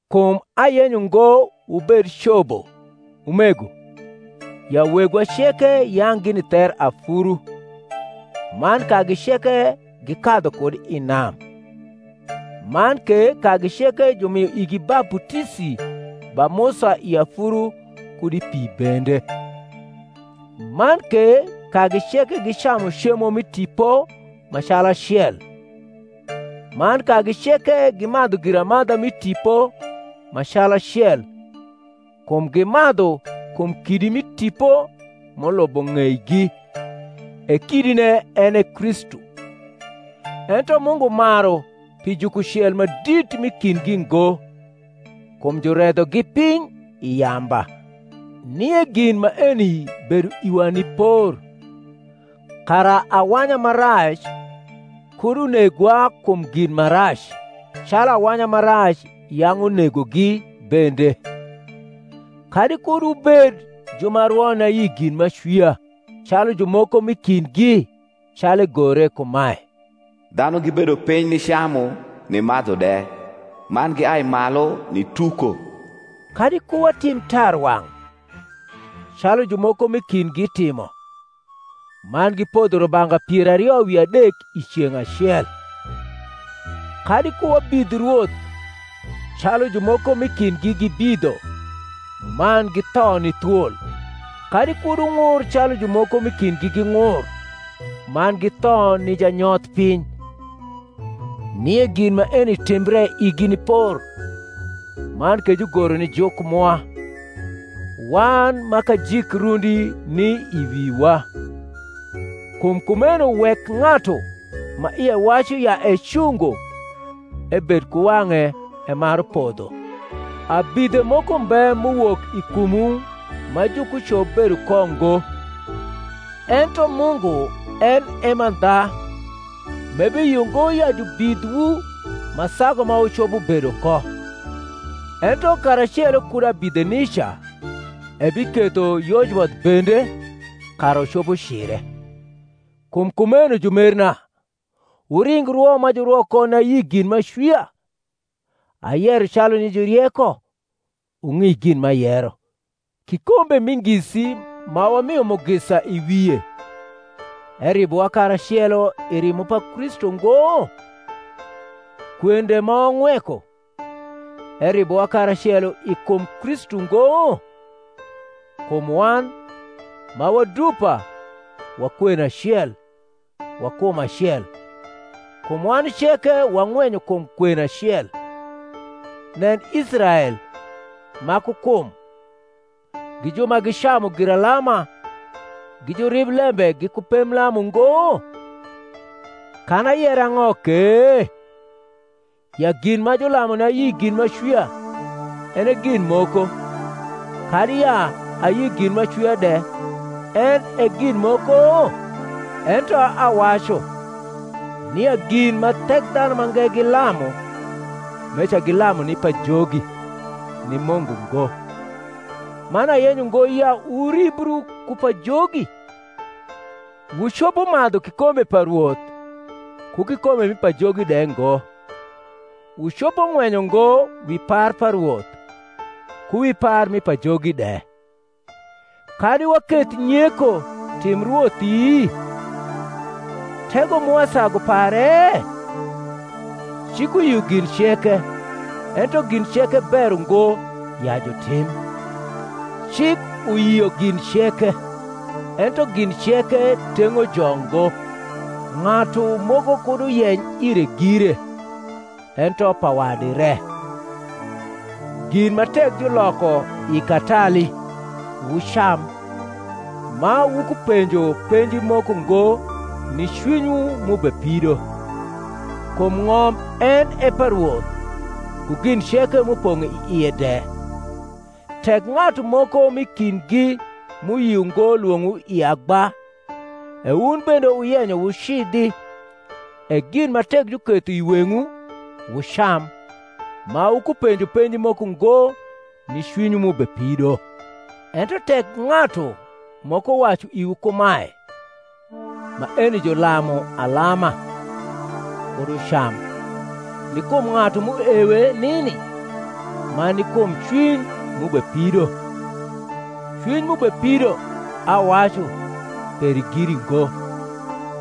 Kum ayenyo ngo wubed cobo, umego, ya wegwa ceke yang’ gini ther afuru, man kagi ceke gikadhu kud i nam; man ke kagi ceke jumio igi baputisi ba Musa i afuru kud i pi bende; man ke kagi ceke gicamu cemo mi tipo ma calacel; man kagi ceke gimadhu giramadha mi tipo ma calacel: kum gimadhu kum kidi mi tipo m’ulubo ng’eigi; e kidine en e Kristu. Ento Mungu maru pi jukucel ma dit m’i kindgi ngo: kum juredhogi piny i yamba. Nie gin maeni bedo iwa ni por, kara awanya ma rac kud unegwa kum gin ma rac, calu awanya ma rac yang’ unegogi bende. Kadi kud wubed ju ma rwo ni ayi gin m’acwia, calu jumoko m’i kindgi; calu egore kumae, Dhanu gibedo piny nicamu nimadhu de, man giai malu nituko. Kadi ku watim tarwang’, calu jumoko m’i kindgi timo, man gipodho rubanga pier ario wi adek i ceng’ acel. Kadi ku wabidh Rwoth, calu jumoko m’i kindgi gibidho,man githo ni thwol. Kadi kud wung’ur calu jumoko m’i kindgi ging’ur, man githo ni janyoth piny. Nie gin maeni timbre igi ni por; man ke jugoro ni juk mwa, wan ma kajik rundi ni i wiwa. Kum kumeno wek ng’atu ma ie wacu ya ecungo ebed ku wang’e emaru podho. Abidhe moko mbe m’uwok i kumwu ma jukucop bedo ko ngo; ento Mungu en e mandha, m’e.. biyio ngo ya jubidhwu ma sagu ma wucopo bedo ko: ento karacelo kud abidhe nica ebiketho yojboth bende, kara wucopo cire. Kum kumeno, jumerna, wuring rwo ma jurwo ko ni ayi gin m’acwia. Ayero calu ni jurieko; wung’i gin m’ayero. Kikombe mi ngisi ma wamio mugisa i wie, eribowa karacelo i rimo pa Kristu ngo? Kwen de ma wang’weko, eribowa karacelo i kum Kristu ngo? kum wan, ma wa dupa, wa kwen acel, wa kum acel: kum wan ceke wang’wenyo kum kwen acel. Nen Israel ma ku kum: gi ju ma gicamu giralama gi juriblembe giku pemblam ungo? Kan ayer ang’o ke? ya gin ma julamu ni ayi gin m’acwia en e gin moko, kadi ya ayi gin m’acwia de en e gin moko? Ento awacu, nia gin ma Thekdhanumange gilamu, meca gilamu ni pajogi, ni Mungu ngo: man ayenyo ngo ya wuribru ku pajogi. Wucopo madhu kikombe pa Rwoth, ku kikombe mi pajogi de ngo: wucopo ng’wenyo ngo wi par pa Rwoth, ku wi par mi pajogi de. Kadi waketh nyeko tim Rwothi? tego mwa sagu pare? Cik uyio gin ceke; ento gin ceke ber ungo ya jutim. Cik uyio gin ceke; ento gin ceke teug’o jo ngo. Ng’atu moko kud uyeny ire gire, ento pa wadi re. Gin ma tek juloko i katali, wucam, ma wukupenjo penji moko ngo ni cwinywu m’ubepido; kum ng’om en e pa Rwoth, ku gin ceke m’upong’ i ie de. Tek ng’atu moko m’i kindgi m’uyio ngo lwong’owu i agba, e wun bende wuyenyo wucidhi; e gin ma tek juketho i weng’wu, wucam, ma wukupenjo penji moko ngo ni cwinywu m’ubepido. Ento tek ng’atu moko wacu iwu kumae, Maeni julamu alama, kud wucam, ni kum ng’atu m’uewe nini, man ni kum cwiny m’ubepido: cwiny m’ubepido, awacu, peri giri ngo,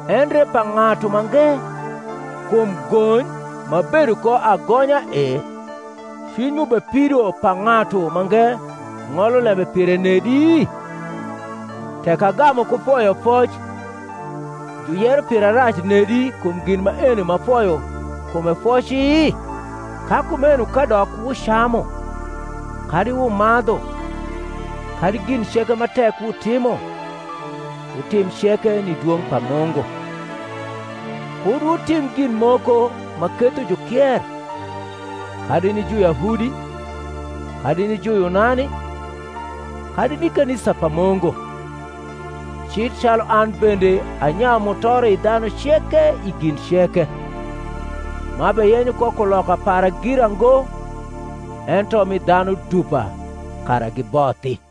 endre pa ng’atu mange; kum gony m’abedo ko agonya e, cwiny m’ubepido pa ng’atu mange ng’olo lembe pire nedi? Tek agamu ku foyofoc, juyero pira rac nedi kum gin maeni m’afoyo kume foci? Ka kumeno kadok wucamu, kadi wumadhu, kadi gin ceke ma tek wutimo, wutim ceke ni dwong’ pa Mungu. Kud wutim gin moko ma ketho jukier, kadi ni Juyahudi, kadi ni Juyunani, kadi ni kanisa pa Mungu: cil calu an bende anyayu mutoro i dhanu ceke i gin ceke, m’abeyenyo ko kuloka para gira ngo, ento mi dhanu dupa, kara gibothi.